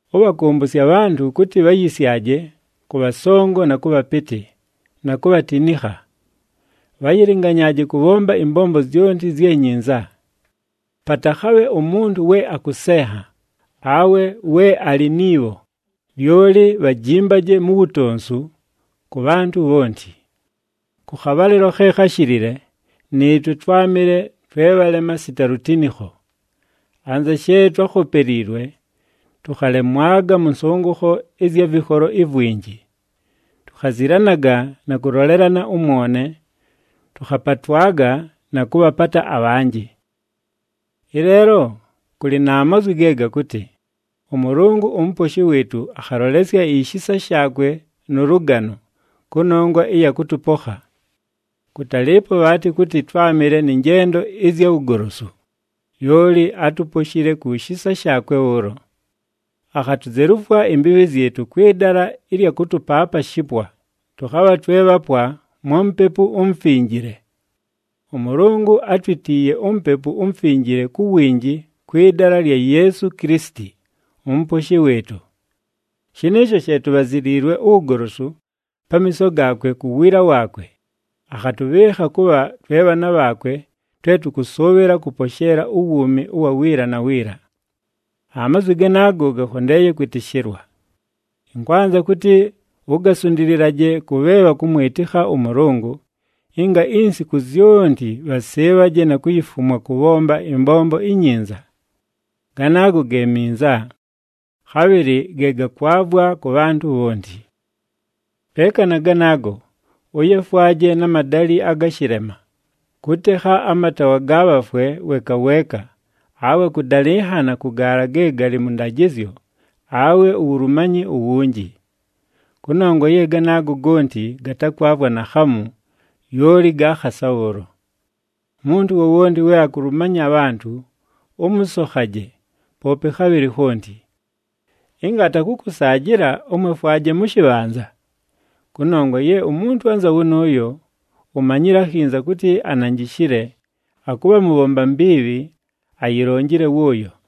Ʉbhakʉmbʉsye abhantʉ kʉtɨ bhayɨsyaje kʉ bhasongo na kʉ bhapɨtɨ, na kubhatinikha. Bhayilinganyaaje kʉbhomba ɨmbombo zyonti zye nyinza. Patakhabhe umuntu we akʉsenha, awe we alɨ ni bho, lyoli bhajimbaje mu wutonsu kʉ bhantʉ bhonti. Kʉ khabhalɨlo khe kháshilile, nɨɨtwe twámɨle twe bhalema sita lutinikho. Anza she twákhopeliilwe, tʉkhalemwaga mʉ nsʉngʉkho ɨzya vɨkholo ivwinji. Tukhazilanaga na kʉlolelana ʉmwone, tʉkhapatwaga na kʉbhapata abhanjɨ. Ɨleelo, kʉlɨ na mazwi ge gakʉtɨ, “ɄMʉlʉngʉ uMuposhi wɨɨtʉ akhalolesya ishisa shaakwe nʉ lʉgano, kʉnongwa ɨya kʉtʉpokha. Kʉtalɨɨpo bhaatɨ kʉtɨ twámɨle nɨ njendo ɨzya wugolosu, lyoli átuposhile ku shisa shaakwe bhʉʉlo. Akhatuzelufwa imbiibhi zyɨtʉ kwɨ dala ɨlya kʉtʉpaapa shipwa, tʉkhabha twe bhapwa mwa Mupepu uMufinjile. ɄMʉlʉngʉ átwitiiye uMupepu uMufinjile ku winji kwɨ dala lya Yeesu Kilisiti, uMuposhi wɨɨtʉ. Shɨnɨɨsho she tubhaziliilwe uwugolosu pamiiso gaakwe ku wiila waakwe, akhatʉbhɨɨkha kʉbha twe bhaana bhaakwe twe tʉkʉsʉʉbhɨla kʉposheela uwuumi ʉwa wiila na wiila.” Amazwi ganaago gakhondeeye kwɨtɨshɨlwa. Ɨnkwanza kʉtɨ ugasundililaje kʉ bhe bhakʉmwɨtɨkha ʉMʉlʉngʉ, ɨnga insiku zyonti bhasɨɨbhaje na kuyifumwa kʉbhomba ɨmbombo inyinza. Ganaago ge minza, khabhɨlɨ ge gakwavwa kʉ bhantʉ bhonti. Peeka na ganaago, ʉyefwaje na madalɨ aga shɨlema, kʉtekha amataawa ga bhafwe weeka weeka, awe kʉdalɨnhana kʉ gaala ge galɨ mʉ ndajɨzyo, awe uwulumanyi uwunji. Kʉnongwa ye ganaago gonti gatakwavwa naakhamu, lyoli ga khasa bhʉʉlo! Umuntu wowonti we akulumanya abhantʉ, ʉmʉsokhaje, poope khabhɨlɨ khonti. Ɨnga atakʉkʉsaajɨla, ʉmwefwaje mʉ shɨbhanza. Kʉnongwa ye umuntu anza wʉnʉʉyo, umanyile akhinza kʉtɨ ananjishile, akʉbha mubhomba mbiibhi, ayilonjile wʉʉyo.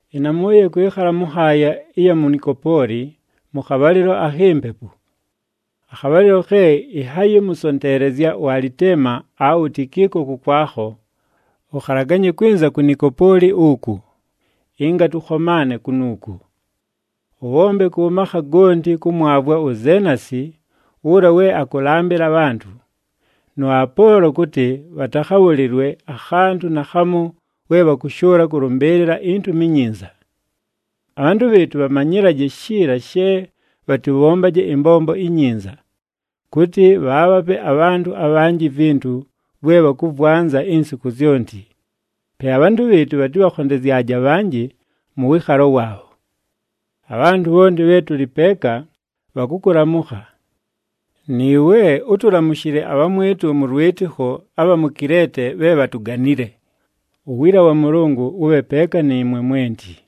Ɨnamʉʉye kwɨkhala mʉ nhaaya ɨya mu Nikopooli mʉ khabhalɨlo akhi mpepu. Akhabhalɨlo khe ɨnhayɨmʉsonteelezya uAlitema awe uTikiiko kʉkwakho, ʉkhalaganye kwɨnza ku Nikopooli uku, ɨnga tʉkhomaane kunuuku. Ʉbhombe kʉ makha gonti kʉmwavwa uZeenasi, ʉla we akʉlambɨla abhantʉ, nʉ Apoolo kʉtɨ bhatakhabhʉlɨlwe akhantʉ naakhamu we bhakʉshʉʉla kʉlʉmbɨɨlɨla iNtumi iNyinza. Abhantʉ bhɨɨtʉ bhamanyɨlaje shiila she bhatɨbhombaje ɨmbombo inyinza, kʉtɨ bhaabhape abhantʉ abhanjɨ ivintu vwe bhakʉvwanza insiku zyonti. Pe abhantʉ bhɨɨtʉ bhatɨbhakhondezyaje abhanjɨ mʉ wɨɨkhalo waabho. Abhantʉ bhonti bhe tʉlɨ peeka, bhakʉkʉlamʉkha. Nɨɨwe, ʉtʉlamʉshɨle abhamwɨtʉ mʉ lwɨtɨkho abha mu Kileete bhe bhatuganile. Uwiila wa Mʉlʉngʉ wʉbhe peeka nɨɨmwe mwenti.